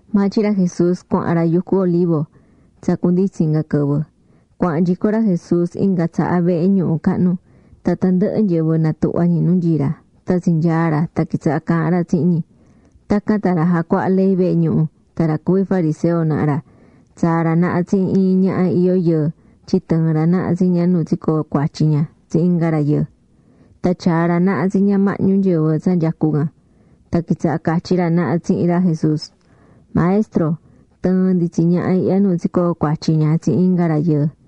Maa tyin ra Jesús cuahán ra yucu Olivo. Tsa cunditsin inga quɨvɨ, cuahán nyico ra Jesús inga tsaha vehe ñuhu cahnu. Tan tandɨhɨ nyɨvɨ natuhva̱ ñi nu nyií ra. Tan tsinyaa̱ ra tan quitsaha̱ caahán ra tsihin ñi. Tacan tan ra jacuahá ley vehe ñuhu tan ra cuví fariseo naha ra tsaa̱ ra naha tsihin iin ñaha iyó yɨɨ tyin tɨɨ̱n ra naha tsi ña nu tsicoo̱ cuatyi ña tsihin inga rayɨɨ. Tan tyaa̱ ra naha tsi ña mahñu nyɨvɨ tsa nyecú can. Tan quitsaha̱ catyí ra naha tsihin ra Jesús: ―Maestro, tɨɨ̱n ndi tsi ñaha ihya nu tsicoo̱ cuatyi ña tsihin inga rayɨɨ.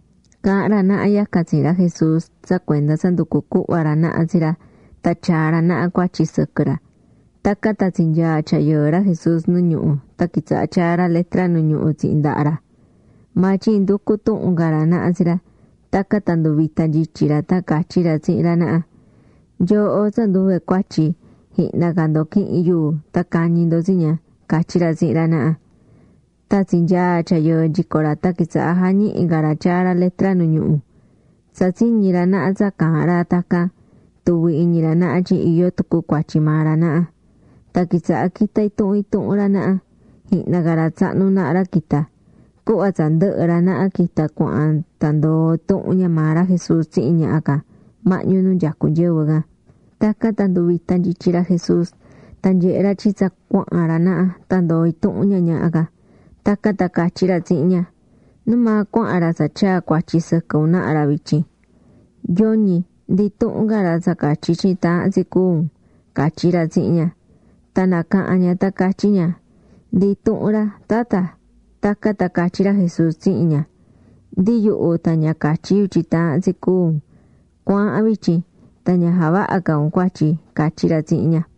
Caahán ra naha yacan tsihin ra Jesús tsa cuenda tsa nducú cuhva ra naha tsi ra tan tyaa ra naha cuatyi sɨquɨ ra. Tacan tan tsinyaa̱ tyayɨɨ ra Jesús nu ñuhu tan quitsaha̱ tyaá ra letra nu ñuhú tsihin nundaha ra. Maa tyin nducú tuhun ca ra naha tsi ra, tacan tan nduvita̱ nyityi ra tan catyí ra tsihin ra naha: ―Nyooho tsa nduve cuatyi jihna ca ndo qu̱ihin yuu tan ca̱ñi ndo tsi ña ―catyí ra tsihin ra naha. Tan tsinyaa̱ tyayɨɨ nyico ra tan quitsaha̱ jañihí ca ra tyaá ra letra nu ñuhu. Tsa tsiñi̱ ra naha tsa caahán ra tacan, tuvi̱ iñi ra naha tyin iyó tucu cuatyi maa ra naha. Tan quitsaha̱ quitá intuhun intuhun ra naha, jihna ca ra tsahnu naha ra quita̱. Cuhva tsa ndɨhɨ̱ ra naha quita̱ cuahán tan ndoo̱ intuhun ña maa ra Jesús tsihin ñaha can mahñu nu nyecú nyɨvɨ can. Tacan tan nduvita̱ nyityi ra Jesús tan nyehe̱ ra tyin tsa cuahán ra naha tan ndoo̱ intuhun ña ñaha can. Tacan tan catyí ra tsihin ña: ―¿Numaa cuahán ra tsa tyaa̱ cuatyi sɨquɨ un naha ra vityin? ¿Yoñi, ndi intuhun ca ra tsa catyí tyin taahán tsi cúu un? ―catyí ra tsihin ña. Tan nacaha̱n ña tan catyí ña: ―Ndi intuhun ra, Tatta. Tacan tan catyí ra Jesús tsihin ña: ―Ndi yuhu tan ña catyí yu tyin taahán tsi cúu un. Cu̱aahan vityin. Tan ña ja̱vaha ca un cuatyi ―catyí ra tsihin ña.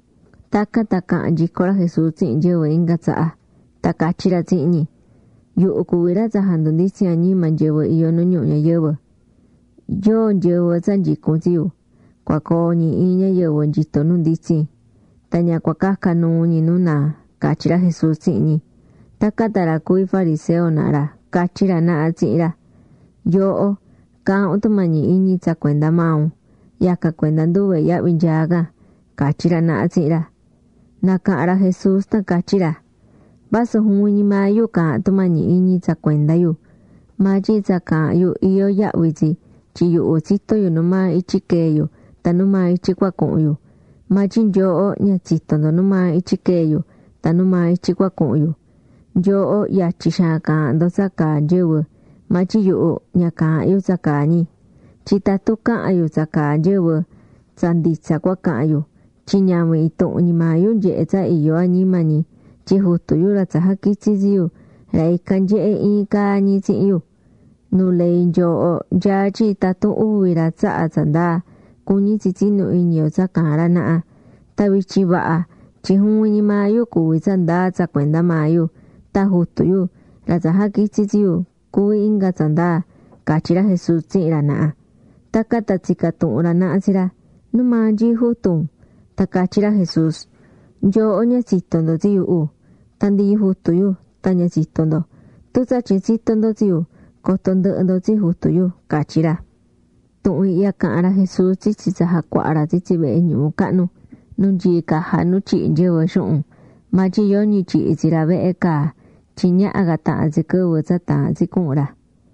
Tacan tan caha̱n nyico ra Jesús tsihin nyɨvɨ inga tsaha, tan catyí ra tsihin ñi: ―Yuhu cuví ra tsa jandunditsín añima nyɨvɨ iyó nu ñuhu ñayɨvɨ. Yóo nyɨvɨ tsa nyicún tsi yu, cua coo ñi iin ñayɨvɨ nyito nu nditsin. Tan ña cua caca nuu ñi nu naa ―catyí ra Jesús tsihin ñi. Tacan tan ra cuví fariseo naha ra catyí ra naha tsihin ra: ―Yooho, caahán un tumañi iñi tsa cuenda maa un. Yacan cuenda nduve yahvi nyaá can ―catyí ra naha tsihin ra. Nacaha̱n ra Jesús tan catyí ra: ―Vasu juvin ñi maa yu caahán tumañi iñi tsa cuenda yu, maa tyin tsa caahán yu iyó yahvi tsi tyin yuhu tsitó yu numaa ityi quee̱ yu tan numaa ityi cua cuhun yu. Maa tyin nyooho ña tsitó ndo numaa ityi quee̱ yu tan numaa ityi cua cuhun yu. Nyooho yatyi xaan caahán ndo tsa caa nyɨvɨ. Maa tyin yuhu, ña caahán yu tsa caa ñi. Tyin tatun cahan yu tsa caa nyɨvɨ, tsa nditsa cua cahan yu. Tyin ñavin intuhun ñi maa yu nyehé tsa iyó añima ñi, tyin Jutu yu ra tsa jaquitsi̱ tsi yu, ra ican nyehé iin caa ñi tsihin yu. Nu ley nyooho nyaá tyin tatun uvi ra tsahá tsa ndaa, cuñí tsi tsinú iñi yo tsa caahán ra naha. Tan vityin vaha tyin juvin ñi maa yu cuví tsa ndaa tsa cuenda maa yu. Tan Jutu yu, ra tsa jaquitsi̱ tsi yu, cuví inga tsa ndaa ―catyí ra Jesús tsihin ra naha. Tacan tan tsica̱ tuhun ra naha tsi ra: ―¿Numaa nyií jutu un? Tan catyí ra Jesús: ―Nyooho ña tsitó ndo tsi yuhu. Tan ndi Jutu yu tan ña tsitó ndo. Tun tsatyin tsitó ndo tsi yu, coto ndɨhɨ ndo tsi Jutu yu ―catyí ra. Tuhun ihya caha̱n ra Jesús tsitsi tsa jacuahá ra tsitsi vehe ñuhu cahnu, nu nyií caja nu tyihí nyɨvɨ xuhun. Maa tyin yoñi tyihi̱ tsi ra vehe caa, tyin ñaha ca tahan tsi quɨvɨ tsa taahán tsi cuhun ra.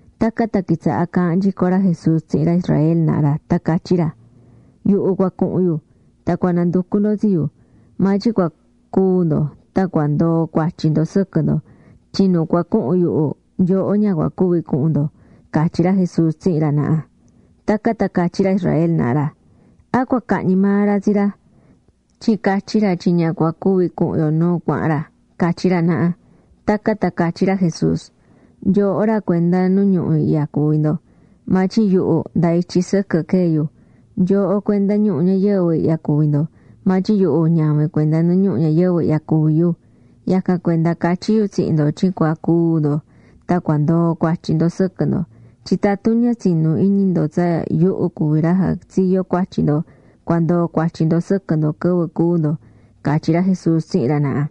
Tacan tan quitsaha̱ caahán nyico ra Jesús tsihin ra Israel naha ra tan catyí ra: ―Yuhu cua cuhun yu, tan cua nanducu ndo tsi yu, maa tyin cua cúu ndo tan cua ndoo cuatyi ndo sɨquɨ ndo. Tyin nu cua cuhun yuhu, nyooho ña cua cuvi cuhun ndo ―catyí ra Jesús tsihin ra naha. Tacan tan catyí ra Israel naha ra: ―¿A cua cahñi maa ra tsi ra? tyin catyí ra tyin ña cua cuvi cuhun yo nu cuahán ra ―catyí ra naha. Tacan tan catyí ra Jesús: ―Nyooho ra cuenda nu ñuhu ihya cuví ndo. Maa tyin yuhu nda ityi sɨquɨ quee̱ yu. Nyooho cuenda ñuhu ñayɨvɨ ihya cuví ndo. Maa tyin yuhu ñavin cuenda nu ñuhu ñayɨvɨ ihya cuví yu. Yacan cuenda catyí yu tsihin ndo tyin cua cúu ndo tan cua ndoo cuatyi ndo sɨquɨ ndo. Tyin tatun ña tsinú iñi ndo tsa yuhu cuví ra jatsiyó cuatyi ndo, cua ndoo cuatyi ndo sɨquɨ ndo quɨvɨ cúu ndo ―catyí ra Jesús tsihin ra naha.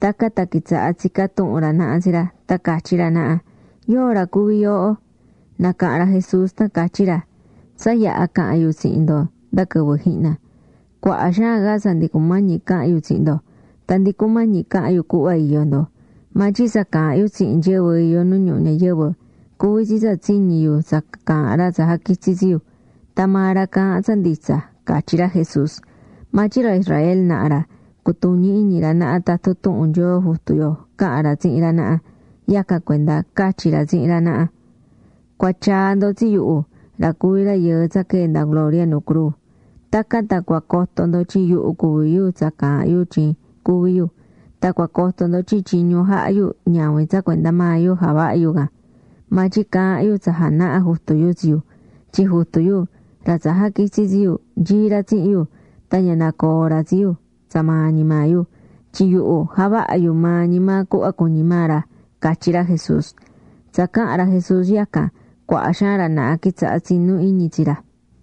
Tacan tan quitsaha̱ tsicá tuhun ra naha tsi ra, tan catyí ra naha: ―¿Yóo ra cuví yooho? Nacaha̱n ra Jesús tan catyí ra: ―Tsa yaha caha̱n yu tsihin ndo nda quɨvɨ jihna. Cuaha xaan ca tsa ndi cumañi cahan yu tsihin ndo, tan ndi cumañi cahan yu cuhva iyó ndo. Maa tyin tsa caahán yu tsihin nyɨvɨ iyó nu ñuhu ñayɨvɨ, cuví tsi tsa tsiñi̱ yu tsa caahán ra tsa jaquitsi̱ tsi yu. Tan maa ra caahán tsa nditsa ―catyí ra Jesús. Maa tyin ra Israel naha ra ña cutuñi̱ iñi ra naha tatun tuhun Nyoo Jutu yo caha̱n ra tsihin ra naha. Yacan cuenda catyi̱ ra tsihin ra naha: ―Cua tyaa ndo tsi yuhu, ra cuví Rayɨɨ tsa quee̱ nda gloria, nu cruu. Tacan tan cua coto ndo tyin yuhu cuví yu tsa caahán yu tyin cuví yu, tan cua coto ndo tyin tyiñu jahá yu ñavin tsa cuenda maa yu javahá yu can, maa tyin caahán yu tsa janahá Jutu yu tsi yu. Tyin Jutu yu, ra tsa jaquitsi̱ tsi yu, nyií ra tsihin yu. Tan ña nacoó ra tsi yu tsa maa ñi maa yu. Tyin yuhu javahá yu maa ñi maa cuhva cuñí ra ―catyí ra Jesús. Tsa caha̱n ra Jesús yacan, cuaha xaan ra naha quitsaha̱ tsinú iñi tsi ra.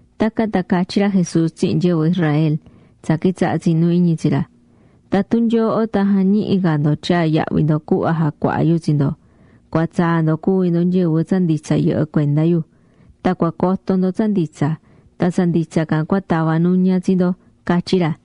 Tacan tan catyí ra Jesús tsihin nyɨvɨ Israel, tsa quitsaha̱ tsinú iñi tsi ra: ―Tatun nyooho tan jañihi ca ndo tyaa yahvi ndo cuhva jacuahá yu tsi ndo, cua tsaa ndo cuvi ndo nyɨvɨ tsa nditsa yɨhɨ cuenda yu. Tan cua coto ndo tsa nditsa. Tan tsa nditsa can cua tava nuña tsi ndo ―catyí ra.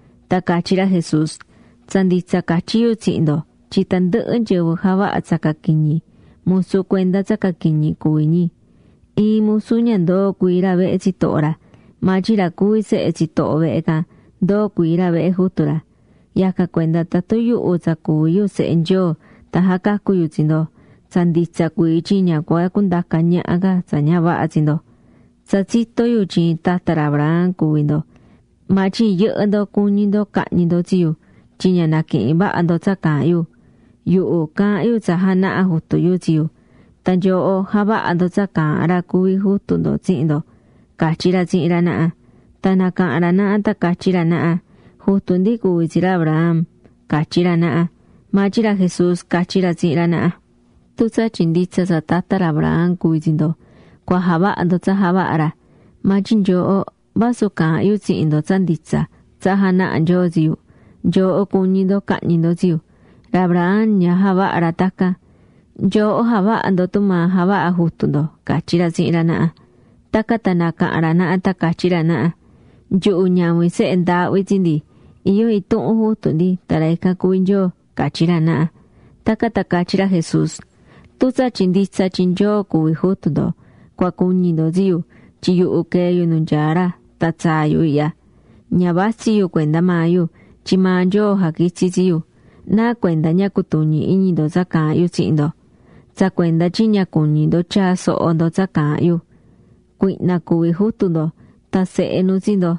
Tan catyí ra Jesús: ―Tsa nditsa catyí yu tsihin ndo tyin tandɨhɨ nyɨvɨ javahá tsa caquiñi, musu cuenda tsa caquiñi cuví ñi. Iin musu ña ndoo cuii ra vehe tsitoho ra. Maa tyin ra cuví sehe tsitoho vehe can, ndoo cuii ra vehe jutu ra. Yacan cuenda tatun yuhu tsa cuví yu Sehe Nyoo tan jacacu yu tsi ndo, tsa nditsa cuii tyin ña cua cundaca ñaha ca tsa ña vaha tsi ndo. Tsa tsitó yu tyin tata ra Abraham cuví ndo. Maa tyin yɨhɨ́ ndo cuñí ndo cahñi ndo tsi yu, tyin ña naquihín vaha ndo tsa caahán yu. Yuhu caahán yu tsa janaha̱ Jutu yu tsi yu. Tan nyooho javahá ndo tsa caahán ra cuví jutu ndo tsihin ndo ―catyí ra tsihin ra naha. Tan nacaha̱n ra naha tan catyí ra naha: ―Jutu ndi cuví tsi ra Abraham ―catyí ra naha. Maa tyin ra Jesús catyí ra tsihin ra naha: ―Tun tsatyin nditsa tsa tata ra Abraham cuví tsi ndo, cua javaha ndo tsa javaha̱ ra. Maa tyin nyooho, vasu caahán yu tsihin ndo tsa nditsa tsa janaha̱ Nyoo tsi yu, nyooho cuñí ndo cahñi ndo tsi yu. ¡Ra Abraham ña javaha̱ ra tacan! Nyooho javahá ndo tumaa javahá jutu ndo ―catyí ra tsihin ra naha. Tacan tan nacaha̱n ra naha tan catyí ra naha: ―Nyuhu ñavin sehe ndaahvi tsi ndi. Iyó intuhun jutu ndi tan ra ican cuví Nyoo ―catyí ra naha. Tacan tan catyí ra Jesús: ―Tun tsatyin nditsa tyin Nyoo cuví jutu ndo, cua cuñi ndo tsi yu. Tyin yuhu quee̱ yu nu nyaá ra tan tsaa̱ yu ihya. Ña vatsí yu cuenda maa yu, tyin maa Nyoo jaquitsi̱ tsi yu. ¿Nacuenda ña cutuñí iñi ndo tsa caahán yu tsihin ndo? Tsa cuenda tyin ña cuñí ndo tyaa soho ndo tsa caahán yu. Cuihna cuví jutu ndo. Tan sehe nu tsi ndo.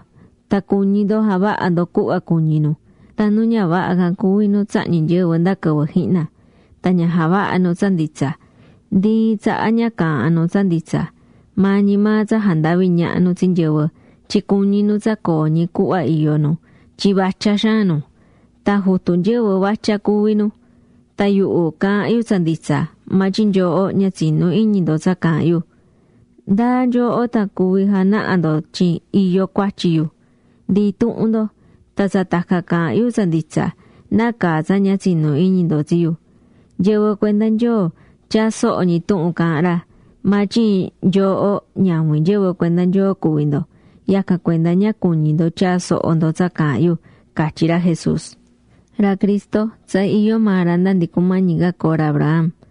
Tan cuñí ndo javaha ndo cuhva cuñí nu. Tan nu ña vaha can cuví nu tsahñí nyɨvɨ nda quɨvɨ jihna. Tan ña javahá nu tsa nditsa. Ndi iin tsaha ña caahán nu tsa nditsa. Maa ñi maa tsa jandavi ñaha nu tsi nyɨvɨ tyin cuñí nu tsa coo ñi cuhva iyó nu tyin vatya xaan nu. Tan jutu nyɨvɨ vatya cuví nu. Tan yuhu caahán yu tsa nditsa, maa tyin nyooho ña tsinú iñi ndo tsa caahán yu. ¿Ndáa nyooho tan cuví janaha ndo tyin iyó cuatyi yu? Ndi intuhun ndo. Tan tsa tacan caahán yu tsa nditsa, ¿nácaa tsa ña tsinú iñi ndo tsi yu? Nyɨvɨ cuenda Nyoo tyaá soho ñi tuhun caahán ra. Maa tyin nyooho ñavin nyɨvɨ cuenda Nyoo cuví ndo, yacan cuenda ña cuñí ndo tyaa soho ndo tsa caahán yu ―catyí ra Jesús. Ra Cristo, tsa iyó maa ra nda ndi cumañi ca coo ra Abraham,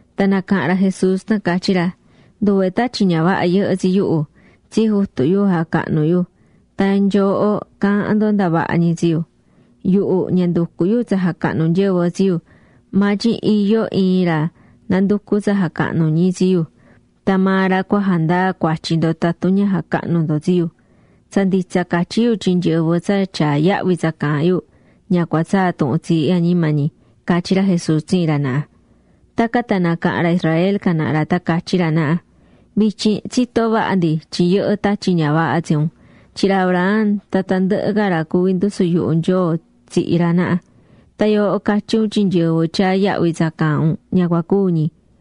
Tan nacaha̱n ra Jesús tan catyí ra: ―Nduve tatyi ña vaha yɨhɨ́ tsi yuhu. Tsi Jutu yu jacahnú yu. Tan nyooho caahán ndo ndavaha ñi tsi yu. Yuhu ña nducú yu tsa jacahnu nyɨvɨ tsi yu, maa tyin iyó iin ra nanducú tsa jacahnu ñi tsi yu. Tan maa ra cua jandaa cuatyi ndo tatun ña jacahnú ndo tsi yu. Tsa nditsa catyí yu tyin nyɨvɨ tsa tyaá yahvi tsa caahán yu ña cua tsaa tuhun tsiihí añima ñi ―catyí ra Jesús tsihin ra naha. Tacan tan nacaha̱n ra Israel can naha ra tan catyí ra naha: ―Vityin tsitó vaha ndi tyin yɨhɨ́ tatyi ña vaha tsi un. Tyin ra Abraham tan tandɨhɨ ca ra cuví ndusu yuhu Nyoo tsihi̱ ra naha. Tan yooho catyí un tyin nyɨvɨ tyaá yahvi tsa caahán un ña cua cúu ñi.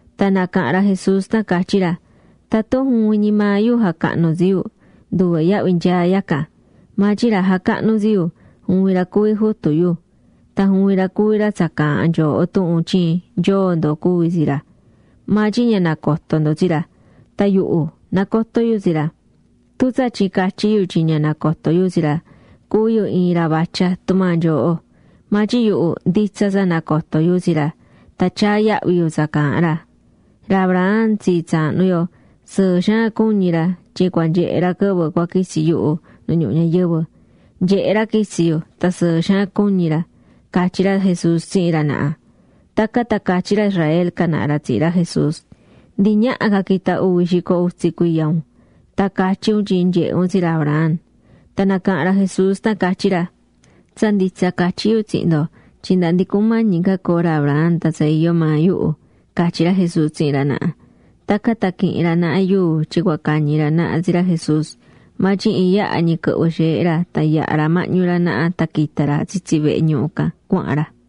Tan nacaha̱n ra Jesús tan catyí ra: ―Tatun juvin ñi maa yu jacahnú tsi yu, nduve yahvi nyaá yacan. Maa tyin ra jacahnú tsi yu, juvin ra cuví Jutu yu. Tan juvin ra cuví ra tsa caahán nyooho tuhun tyin Nyoo ndo cuví tsi ra. Maa tyin ña nacotó ndo tsi ra. Tan yuhu, nacotó yu tsi ra. Tun tsatyin catyí yu tyin ña nacotó yu tsi ra, cuví yu iin ra vatya tumaa nyooho. Maa tyin yuhu nditsa tsa nacotó yu tsi ra, tan tyaá yahvi yu tsa caahán ra. Ra Abraham tsii tsaahnu yo sɨɨ xaan cuñi̱ ra tyin cua nyehe ra quɨvɨ cua quitsi yuhu nu ñuhu ñayɨvɨ. Nyehe̱ ra quitsi̱ yu tan sɨɨ xaan cuñi̱ ra ―catyí ra Jesús tsihin ra naha. Tacan tan catyí ra Israel can naha ra tsihin ra Jesús: ―Ndi ñaha ca quita uvi xico utsi cuiya un, ¡tan catyí un tyin nyehe̱ un tsi ra Abraham! Tan nacaha̱n ra Jesús tan catyí ra: ―Tsa nditsa catyí yu tsihin ndo tyin nda ndi cumañi ca coo ra Abraham tan tsa iyó maa yuhu ―catyí ra Jesús tsihin ra naha. Tacan tan quihi̱n ra naha yuu tyin cua cañi ra naha tsi ra Jesús. Maa tyin iin yaha ñi quɨhvɨ̱ xeehe ra tan yaha̱ ra mahñu ra naha tan quita̱ ra tsitsi vehe ñuhu can cuahán ra.